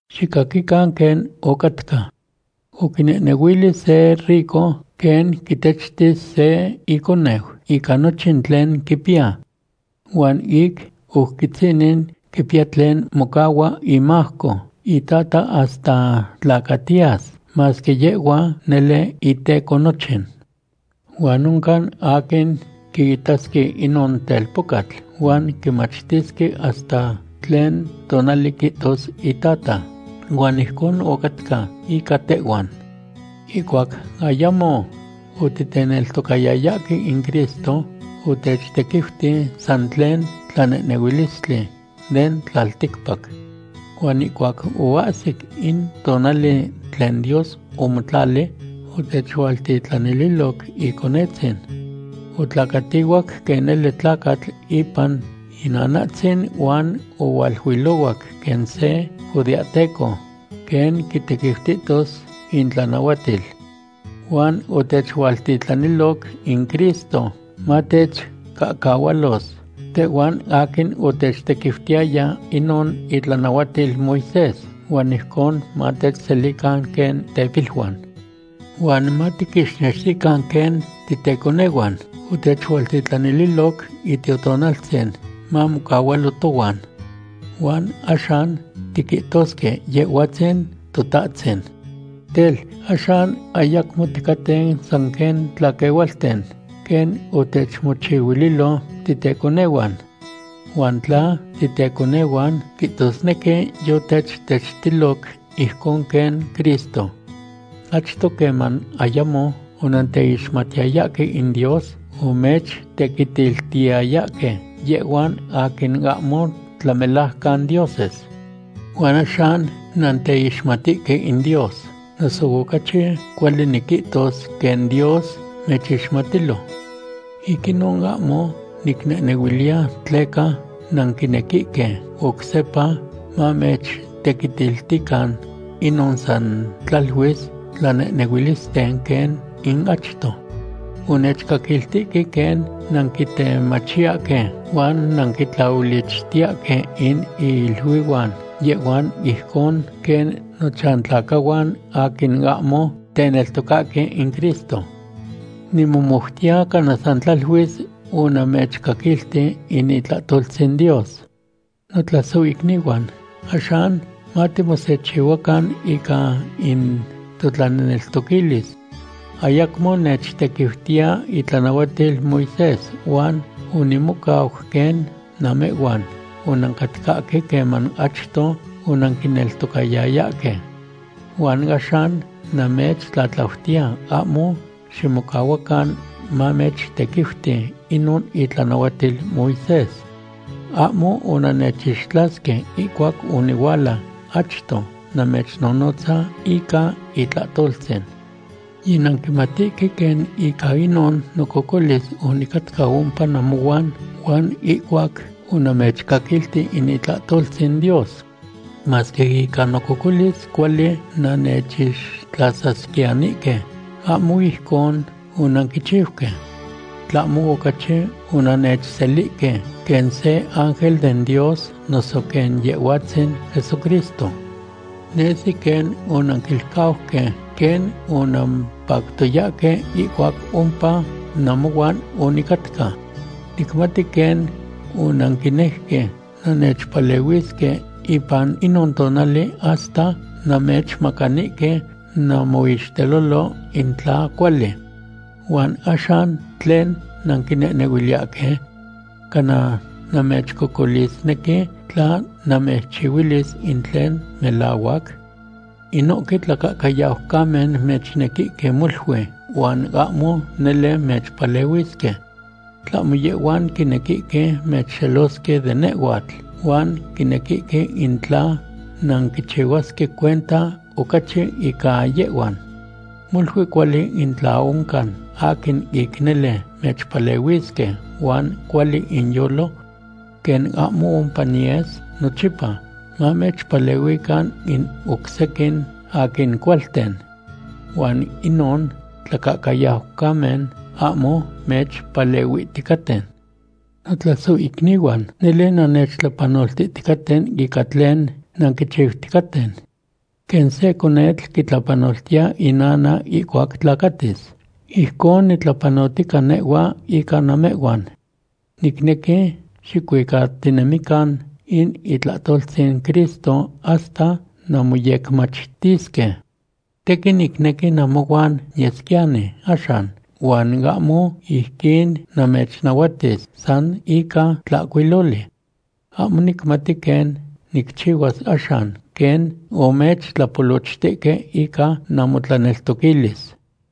Xicaquican quen ocatca. Oquinehnehuili se rico quen quitechtis se iconeu ica nochin tlen quipiya. Huan ic oc quitzinin quipiya tlen mocahua imajco itata hasta tlacatiyas, masque yehhua nele iteco nochin. Huan oncan aquin quiitasque inon telpocatl huan quimachtisque hasta tlen tonali quihtos itata. Huan ijcon ocatca ica tehhuan. Ihcuac ayamo otiteneltocayayahque in Cristo, otechtequiuti san tlen tlanehnehuilistli den tlaticpac. Huan ihcuac oahsic in tonali tlen Dios omotlali, otechualtitlanililoc Iconetzin. Otlacatihuac quen nele tlacatl ipan inanatzin huan ohualuilohuac quen se judeahteco quen quitequiutihtos intlanahuatil. Huan otechualtitlaniloc in Cristo matechcahcahualos tehhuan aquin otechtequiutiyaya inon itlanahuatil Moisés, huan ijcon matechselican quen tepiluan. Huan matiquixnextican quen titeconehuan, otechualtitlanililoc Itiotonaltzin mamocahualo tohuan. Huan axan tiquihtosque Yehhuatzin Totahtzin. Tel, axan ayacmo ticaten san quen tlaquehualten, quen otechmochihuililo titeconehuan. Huan tla titeconehuan, quihtosnequi yotechtechtiloc ijcon quen Cristo. Achto, queman ayamo onanteixmatiyayahque in Dios, omechtequitiltiyayahque yehhuan aquin ahmo tlamelajcan dioses. Huan axan nanteixmatihque in Dios, noso ocachi cuali niquihtos, quen Dios mechixmatilo. Ic inon ahmo nicnehnehuiliya tleca nanquinequihque oc sepa mamechtequitiltican inon san tlaluis tlanehnehuilisten quen in achto. Onechcaquiltihque quen nanquitemachiyahque huan nanquitlahuilichtiyahque in iluihuan yehhuan ijcon quen nochantlacahuan aquin ahmo teneltocahque in Cristo. Nimomoutiya cana san tlaluis onamechcaquilti in itlahtoltzin Dios. Notlasohicnihuan, axan matimosechihuacan ica in totlaneltoquilis. Ayacmo nechtequiutiya itlanahuatil Moisés huan onimocau quen namehhuan onancatcahque queman achto onanquineltocayayahque. Huan axan namechtlatlautiya ahmo ximocahuacan mamechtequiuti inon itlanahuatil Moisés. Ahmo onannechixtlasque ihcuac onihuala achto namechnonotza ica itlahtoltzin. Yinanquimatihque quen ica inon nococolis onicatca ompa namohuan huan ihcuac onamechcaquilti in itlahtoltzin Dios. Masque ica nococolis cuali nannechixtlasasquiyanihque, ahmo ijcon onanquichiuque. Tlahmo ocachi onannechselihque quen se ángel den Dios noso quen Yehhuatzin Jesucristo. Nesi quen onanquilcauque quen onampactoyahque ihcuac ompa namohuan onicatca. Nicmati quen onanquinejque nannechpalehuisque ipan inon tonali hasta nannechmacanihque namoixtelolo in tla cuali. ¿Huan axan tlen nanquinehnehuiliyahque? ¿Cana namechcocolisnequi tla namechiluis in tlen melahuac? Inohque tlacahcayaucamen mechnequihque molui huan ahmo nele mechpalehuisque. Tlahmo yehhuan quinequihque mechxelosque de nehhuatl huan quinequihque in tla nanquinchihuasque cuenta ocachi ica yehhuan. Molui cuali in tla oncan aquin ic nele mechpalehuisque huan cuali inyolo. Quen ahmo ompa niyes nochipa, mamechpalehuican in oc sequin aquin cualten. Huan inon tlacahcayaucamen ahmo mechpalehuihticaten. Notlasohicnihuan, nele nannechtlapanoltihticaten ica tlen nanquichiuticaten. Quen se conetl quitlapanoltiya inana ihcuac tlacatis, ijcon nitlapanotica nehhua ica namehhuan. Nicnequi xicuicatinemican in itlahtoltzin Cristo hasta nanmoyecmachtisque. Tequin nicnequi namohuan niyesquiyani axan huan ahmo ijquin namechnahuatis san ica tlahcuiloli. Ahmo nicmati quen nicchihuas axan quen omechtlapolochtihque ica namotlaneltoquilis.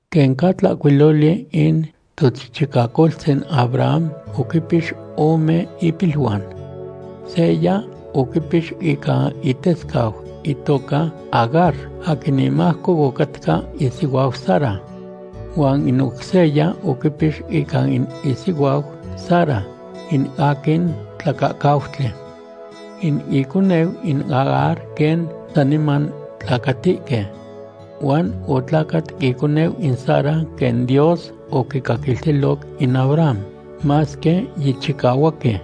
Quen ca tlahcuiloli, in tochichicacoltzin Abraham oquipix ome ipiluan. Seya oquipix ica itescau itoca Agar, aquin imajco ocatca isihuau Sara. Huan in oc seya oquipix ica in isihuau Sara, in aquin tlacahcautli. In iconeu in Agar quen saniman tlacatihque. Huan otlacat iconeu in Sara quen Dios oquicaquiltiloc in Abraham, masque yichicahuaqui.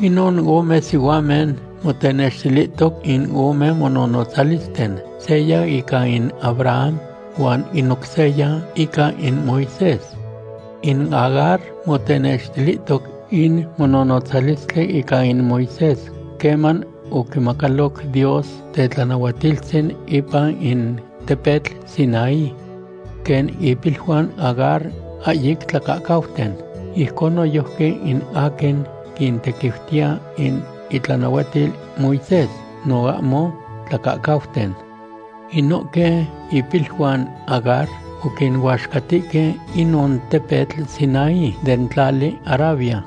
Inon ome sihuamen motenextilihtoc in ome mononotzalisten, seya ica in Abraham huan in oc seya ica in Moisés. In Agar motenextilihtoc in mononotzalistli ica in Moisés queman oquimacaloc Dios tetlanahuatiltzin ipan in tepetl Sinaí. Quen ipiluan Agar ahyic tlacahcauten, ijcon noyojqui in aquin quintequiutiya in itlanahuatil Moisés no ahmo tlacahcauten. Inohque ipiluan Agar oquinuaxcatihque inon tepetl Sinaí den tlali Arabia.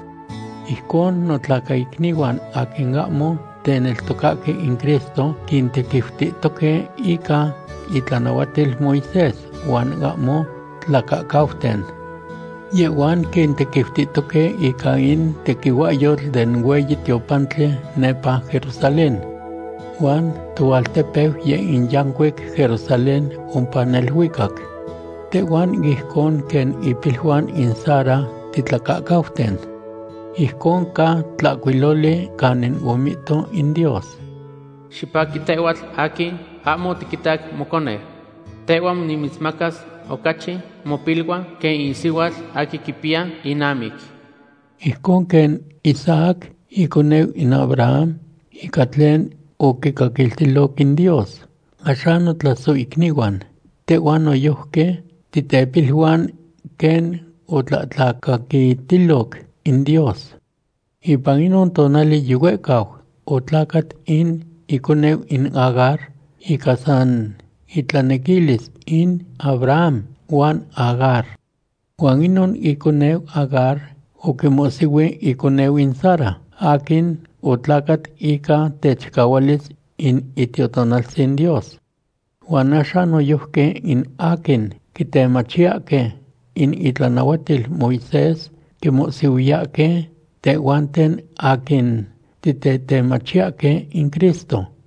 Ijcon, notlacaicnihuan aquin ahmo teneltocahque in Cristo quintequiutihtoque ica itlanahuatil Moisés huan ahmo tlacahcauten. Yehhuan quintequiutihtoque ica in tequihuahyotl den hueyi tiopantli nepa Jerusalén. Huan toaltepeu yeh in yancuic Jerusalén ompa neluicac. Tehhuan ijcon quen ipiluan in Sara titlacahcauten. Ijcon ca tlahcuiloli canin omihto in Dios: Xipaqui tehhuatl aquin ahmo otiquitac moconeu. Tehhua nimitzmacas ocachi mopiluan quen in sihuatl aquin quipiya inamic. Ijcon quen Isaac iconeu in Abraham ica tlen oquicaquiltiloc in Dios, axan notlasohicnihuan, tehhuan noyojqui titepiluan quen otlatlacaquitiloc in Dios. Ipan inon tonali yihuehcau otlacat in iconeu in Agar ica san intlanequilis in Abraham huan Agar. Huan inon iconeu Agar oquimohsihui iconeu in Sara aquin otlacat ica techicahualis in Itiotonaltzin Dios. Huan axan noyojqui in aquin quitemachiyahque in itlanahuatil Moisés quinmohsihuayahque tehhuanten aquin titetemachiyahque in Cristo.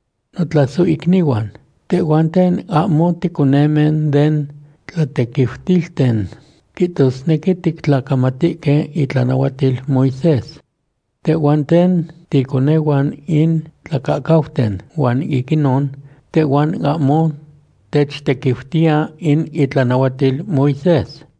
Notlasohicnihuan, tehhuanten ahmo ticonemen den tlatequiutilten, quihtosnequi tictlacamatihque itlanahuatil Moisés. Tehhuanten ticonehuan in tlacahcauten huan ic inon tehhuan ahmo techtequiutiya in itlanahuatil Moisés.